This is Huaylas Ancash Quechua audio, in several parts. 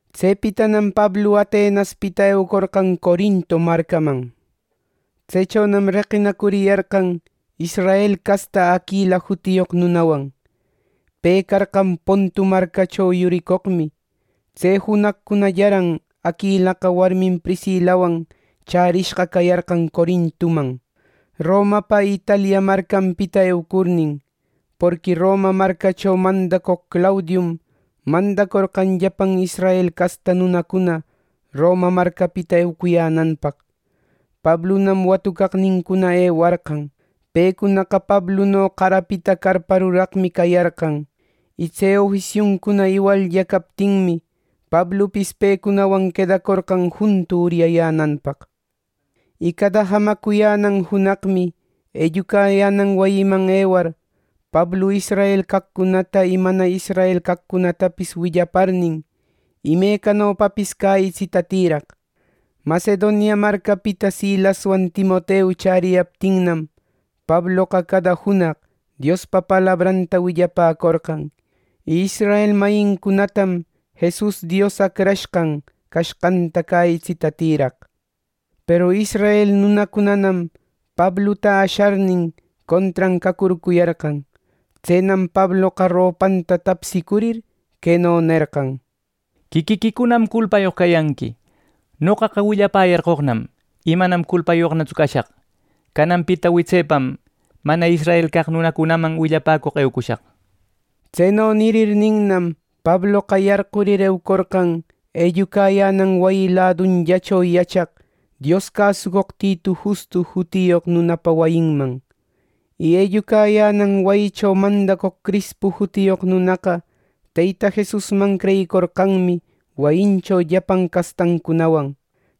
Tsepitanam Pablu Atenaspita eucorqan Corinto marcaman. Tsechonam reqinacuriyarqan israel casta Aquila jutiyoq nunawan. Pe carqan Pontu marcacho yuricoqmi. Tse junaqcunallaran Aquilaqa warmin Priscilawan chärishqa cayarqan Corintoman, ˻Romapa˼ Italia marcanpita eucurnin. Porqui Roma marcacho mandacoq Claudium mandacorqan llapan israel casta nunacuna Roma marcapita eucuyänanpaq. Pablunam watucaqnincuna ewarqan. Pecunaqa Pabluno qarapita carpa ruraqmi cayarqan, y tse ofisiuncuna iwallla captinmi, Pablupis pewan quedacorqan juntu uryayänanpaq. Y cada jamacuyänan junaqmi ellucayänan wayiman ewar, Pablu israel caqcunata y mana israel caqcunatapis willaparnin, imecanopapis cäyitsita tïraq. Macedonia marcapita Silaswan Timoteu chäriyaptinnam, Pabloqa cada junaq Diospa palabranta willapäcorqan. Y israel mayincunatam Jesus Dios Acrashqan cashqanta cäyitsita tïraq. Peru israel nunacunanam Pabluta asharnin, contran cacurcuyarqan. Tsenam Pabloqa ropanta tapsicurir, queno nerqan: —Quiquiquicunam culpayoq cayanqui. Noqaqa willapäyarqoqnam, y manam culpayoqnatsu cashaq. Cananpita witsepam mana israel caq nunacunaman willapäcoq eucushaq. Tseno nirirninnam Pabloqa yarqurir eucorqan ellucayänan wayi ladunllacho yachaq Dios cäsucoq Titu Justo jutiyoq nunapa wayinman. Y ellucayänan wayicho mandacoq Crispu jutiyoq nunaqa Teyta Jesusman creyicorqanmi wayincho llapan castancunawan.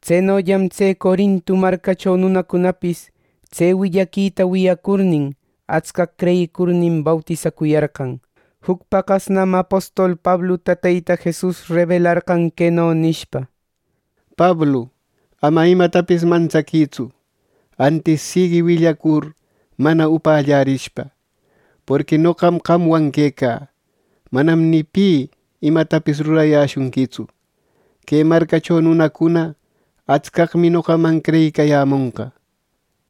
Tsenollam tse Corinto marcacho nunacunapis tse willaquita wiyacurnin, atscaq creyicurnin bautisacuyarqan. Juc paqasnam apostol Pabluta Teyta Jesus rebelarqan queno nishpa: “Pablu, ama imatapis mantsaquïtsu, antis siguï willacur mana upallarishpa. Porqui noqam qamwan quecä. Manam ni pi imatapis rurayäshunquitsu. Que marcacho nunacuna atscaqmi noqaman creyicayämonqa” nir.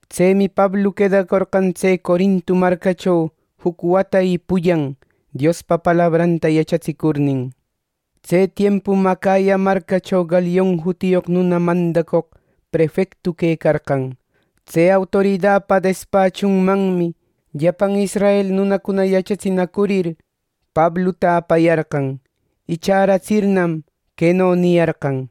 Tsemi Pablu quedacorqan tse Corinto marcacho juc wata y pullan Diospa palabranta yachatsicurnin. Tse tiempum Acaya marcacho Galion jutiyoq nuna mandacoq prefecto quecarqan. Tse autoridapa despachunmanmi llapan israel nunacuna yachatsinacurir, Pabluta apayarqan. Y chäratsirnam, queno niyarqan: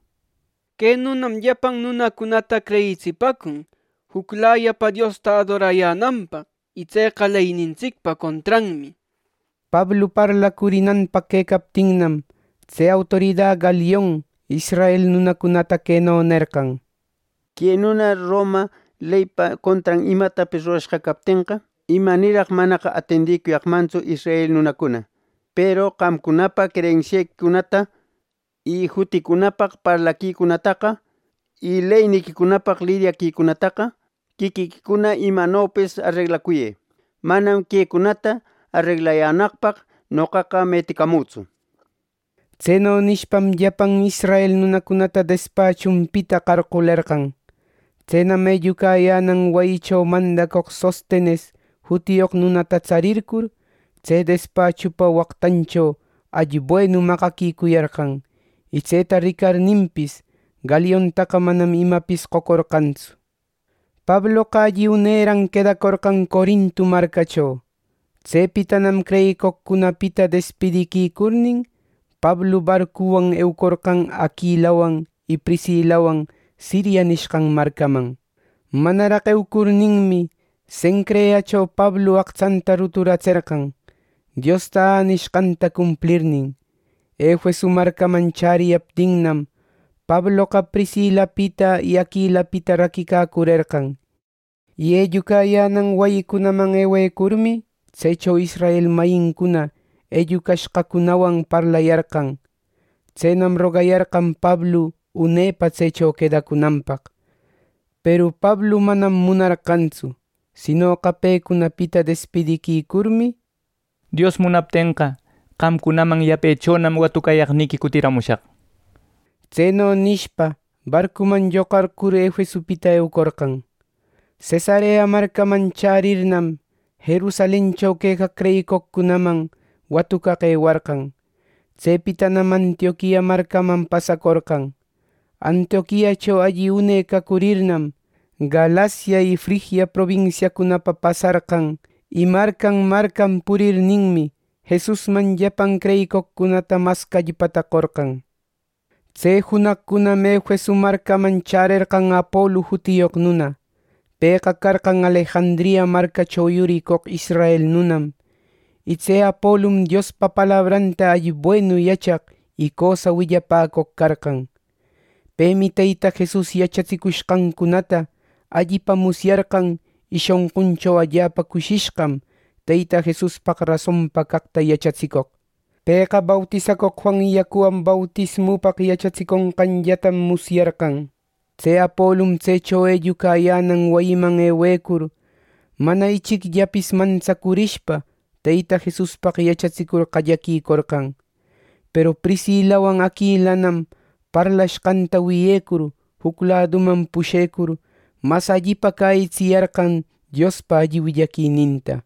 —Que nunam llapan nunacunata creyitsipäcun juclayapa Diosta adorayänanpaq. Y tseqa leynintsicpa contranmi —nir. Pablu parlacurinanpaq quecaptinnam tse autorida Galion israel nunacunata queno nerqan: —Que nuna ˻Roma˼ leypa contran imatapis rurashqa captenqa, ¡Imanirraq manaqa atendicuyaqmantsu israel nunacuna! Peru qamcunapa creyensiequicunta, y juticunapaq parlaquicunataqa, y leyniquicunapaq liryaquicunataqa, quiquiquicuna imanopis areglacuyë. Manam quecunata areglayänaqpaq noqaqa meticamütsu —nir. Tseno nishpam llapan israel nunacunata despachunpita qarqulerqan. Tsenam ellucayänan wayicho mandacoq Sostenes jutiyoq nunatana tsarircur, tse despachupa waqtancho allibuenu maqaquicuyarqan. Y tseta ricarninpis, Galiontaqa manam imapis qocorqantsu. Pabloqa alli uneran quedacorqan Corinto marcacho. Tsepitanam creyicoqcunapita despidiquicurnin, Pablu barcuwan eucorqan Aquilawan y Priscilawan Siria nishqan marcaman. Manaraq eucurninmi, Cencreacho Pablu aqtsanta ruturatserqan, Diosta änishqanta cumplirnin. Efeso marcaman chäriyaptinnam Pabloqa Priscilapita y Aquilapita raquicacurerqan. Y ellucayänan wayicunaman ewecurmi, tsecho israel mayincuna ellucashqacunawan parlayarqan. Tsenam rogayarqan Pablu unepa tsecho quedacunanpaq, peru Pablu manam munarqantsu, Sinoqa pecunapita despidiquicurmi, “Dios munaptenqa qamcunaman yapechonam watucayaqniqui cutiramushaq” nishpa, barcuman lloqarcur Efesopita eucorqan. Cesarea marcaman chärirnam, Jerusalencho quecaq creyicoqcunaman watucaq ewarqan. Tsepitanam Antioquia marcaman pasacorqan. Antioquiacho alli une cacurirnam, Galacia y Frigia probinsiacunapa pasarqan y marcan marcan purirninmi, Jesusman llapan creyicoqcunata mas callpata qorqan. Tse junaqcunam Efeso marcaman chärerqan Apolu jutiyoq nuna. Pëqa carqan Alejandria marcacho yuricoq israel nunam. Y tse Apolum Diospa palabranta alli buenu yachaq y cösa willapäcoq carqan. Pemi Teyta Jesus yachatsicushqancunata allipa musyarqan y shonquncho allapa cushishqam Teyta Jesuspaq rasonpa caqta yachatsicoq. Pëqa bautisacoq Juan yacuwan bautismupaq yachatsiconqanllatam musyarqan. Tse Apolum tsecho ellucayänan wayiman ewecur mana ichicllapis mantsacurishpa Teyta Jesuspaq yachatsicur qallaquicorqan. Peru Priscilawan Aquilanam parlashqanta wiyecur juc laduman pushecur mas allipa cäyitsiyarqan Diospa alli willaquininta.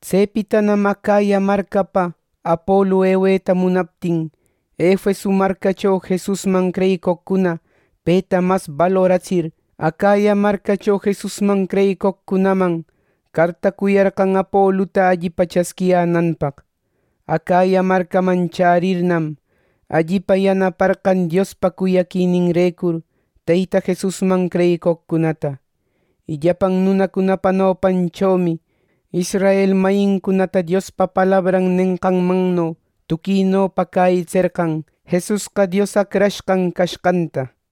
Tsepitanam Acaya marcapa Apolu eweta munaptin Efeso marcacho Jesusman creyicoqcuna peta mas baluratsir, Acaya marcacho Jesusman creyicoqcunaman cartacuyarqan Apoluta allipa chasquiyänanpaq. Acaya marcaman chärirnam, allipa yanaparqan Diospa cuyaquininrecur Teyta Jesusman creyicoqcunata. Y llapan nunacunapa nopanchomi israel mayincunata Diospa palabran nenqanmanno tuquinopa cäyitserqan Jesusqa Dios Acrashqan cashqanta.